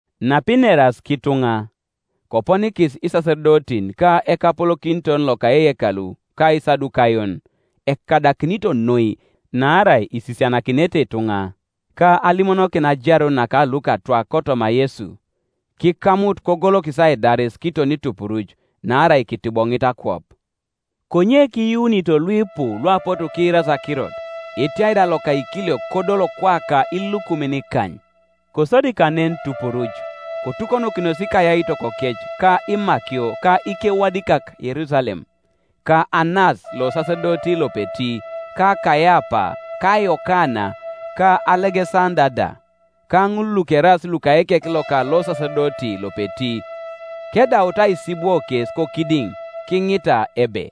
Napineras kituŋa, koponikis isasedotin ka ekapolokiton loka eyekalu ka Isadukayon, ekadakinito noi naarai isisianakinete ituŋa, ka alimono kin ajarun naka lukatwak kotoma Yesu. Kikamut kogolokis aidaris kiton tupuruc: naarai kitiboŋit akwap. Konye kiyuunito luipu luapotu kiirasi akirot; etiai da loka ikiliok kodol kwaka ilukumin ikany. Kosodi kanen tupuruc, kotukonokinos ikayaitokokec ka imakio ka ikewadikak Yerusalem; ka Anas losasedoti lopeti, ka Kaiapa, ka Yokana, ka Alegesanda da, ka ŋul lukeraas luka ekek loka losasedoti lopeti. Kedautu aisibwo kes kokidiŋ, kiŋita ebe,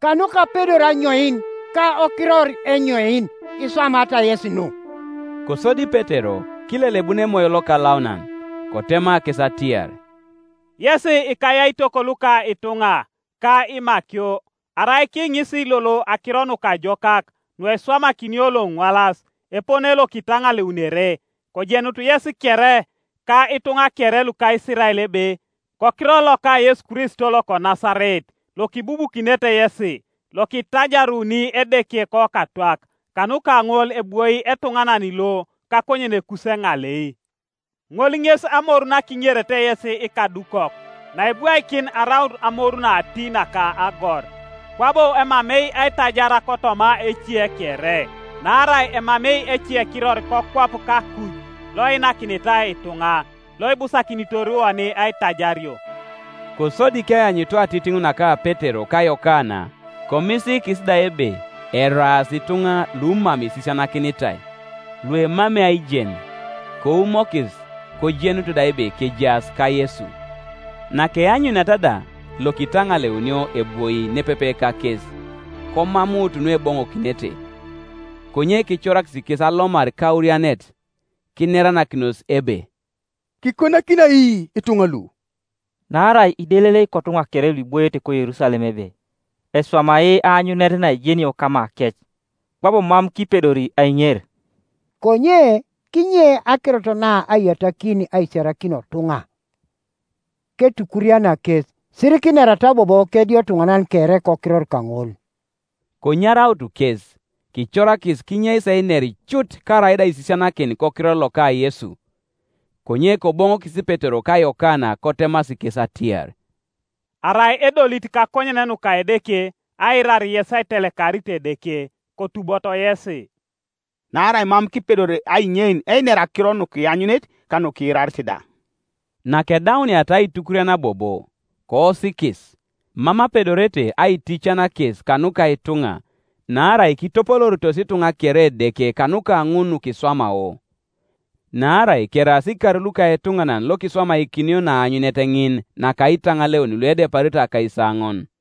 “Kanuka apedor anyoin, ka okiror enyoin, iswamaata yesi nu?” Kosodi Petero, kilelebun Emoyo Lokalaunan, kotema kes atiar, “Yes ikayaitok luka ituŋa, ka imakio, arai kiiŋisi lolo akiro nukajokak nueswamakinio loŋwalas, epone lokitanaleunere, kojenutu yesi kere, ka ituŋa kere luka Isirael ebe, Kokiror loka Yesu Kristo loko Nasaret, lokibubukinete yesi, lokitajaruni Edeke kokatwak, kanuka ŋol ebwoi etuŋanan lo kakonyenekus eŋalei, ŋol ŋes amoru nakinerete yesi ikadukok, naebwaikin araut amoru nati naka agor. Kwabo emamei aitajar kotoma ece kere: naarai emamei ecekiror kokwap kakuj loeinakinitai ituŋa, loibusakinitor oni aitajario.” Kosodi keanyutu atitiŋ naka Petero ka Yokana, komisiikis da ebe eraas ituŋa lumam isisianakinitai, luemamei aijen, koumokis; kojenut da ebe kejaas kaYesu. Nakeanyuniata da lokitaŋaleunio ebwoi nepepe kakes, komamuut nueboŋokinete, Konye kicorakis kes alomar kaurianet, kineranakinos ebe, “Kikonakini ai ituŋa lu? Naarai idelelei kotuŋa kere luiboiete koYerusalem ebe eswamai aanyunet naejenio kamakec; kwabo mam kipedori aiŋer. Konye kinye akirot na aiyatakin aisiarakin otuŋa, ketukuriana kes, sirikinerata bobo kediotunanan kere kokiror kaŋol.” Konyaraut kes, kicorakis kinyeis einer cut karaida aisisianakin kokiror loka Yesu. Konye koboŋokis Petero ka Yokana kotemasi kes atiar, “Arai edolit kakonyen nuka Edeke aiirar yes aitelekarit Edeke, kotuboto yesi: naarai mam kipedori ainyein einer akiro nukianyunit ka nukiirarit da.” Nakedauniata aitukurian bobo, koosikis, mam apedorete aitican kes kanuka ituŋa; naarai kitopolooritos ituŋa kere Edeke kanuka ŋun nukiswamao. Naarai keraas ikar luka etuŋanan lokiswamakinio naanyunet ŋin naka aitaŋaleun luedeparito akaisaoŋon.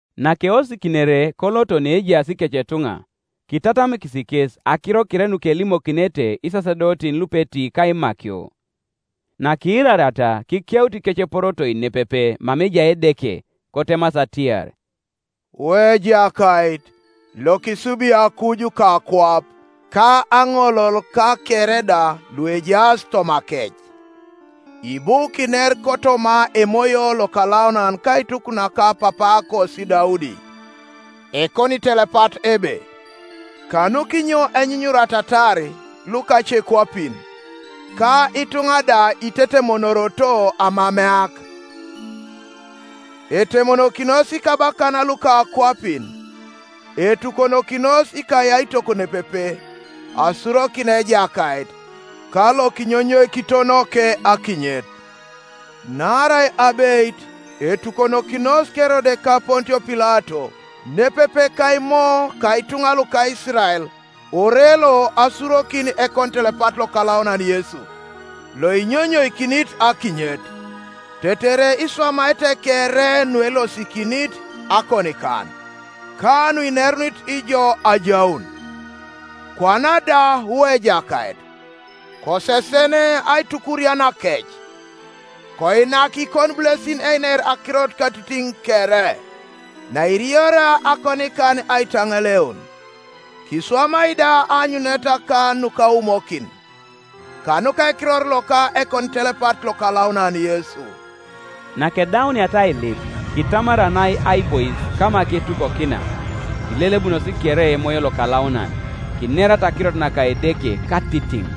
Nakeosikinere koloto neejaas ikecetuŋa, kitatamikis kes akiro kere nukelimokinete isasedotin lupeti ka imakio. Nakiirariata, kikeut ikeceporotoi nepepe mama ejai Edeke, kotemasi atiar, “Wu Ejakait, lokisubi akuj, ka akwap, ka aŋolol, ka kere da luejaas tomakec: ibu kiner kotoma Emoyo Lokalaunan kaituk naka papaakosi Daudi ekonitelepat ebe, ‘Kanukinyo enyunyuratatar lukacekwapin, Ka ituŋa da itetemonoroto aamameak? Etemonokinos ikabakan luka akwapin, Etukonokinos ikayaitok nepepe, Asurokin Ejakait, ka Lokinyonyoikitonoke akinyet.’ Naarai abeit etukonokinos Kerode ka Pontio Pilato, nepepe ka Imo ka ituŋa luka Isirael ore lo asurokin ekonitelepat lokalaunan Yesu, loinyonyoikinit akinyet, tetere iswamaete kere nuelosikinit akonikan, ka nuinerunit ŋol ajaun. Kwana da, wu Ejakait, kosesen aitukurianakec: koinak ikonibulesin einer akirot katitiŋ kere, nairioria akonikan aitaŋaleun; kiswamai da aanyuneta ka nukaumokin kanuka ekiror loka ekonitelepat lokalaunan Yesu.” Nakedauniata ailip, kitamaranai aibois kama ketukonokina; kilelebunos kere Emoyo Lokalaunan, kinerata akirot naka Edeke katitiŋ.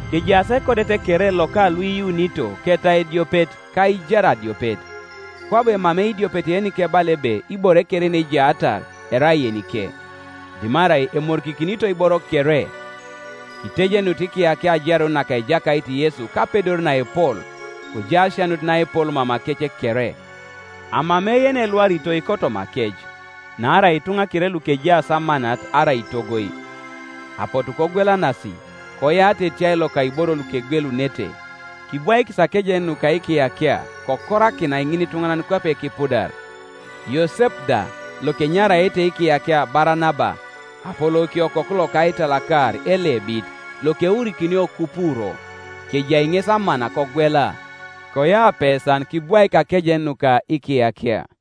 Kejaas ekodet kere loka luiyuunito ketau ediopet ka aijar adiopet: kwabo emamei idiopet yenikebala ebe ibore kere yenejaatar erai yenike; dimarai emorikikinito iboro kere. Kitejenut ikiyakia ajarun naka Ejakait Yesu kapedor naepol, kojai asianut naepol mamakec kere. Amamei yenilwaritoi kotomakec, naarai ituŋa kere lukejaas amanat arai itogoi, apotu kogwelanasi, koyaata etiai loka iboro lukegwelunete kibwaikis akejen nuka ikiyakia: kokorakinai ŋinituŋanan kwape kipudar. Yosep da, lokenyaraete ikiyakia Baranaba, (apolouke Okoku loka aitalakaar) Elebit, lokeurikinio Kupuro, kejai ŋes amana kogwela, koyau apesan kibwaik akejen nuka ikiyakia.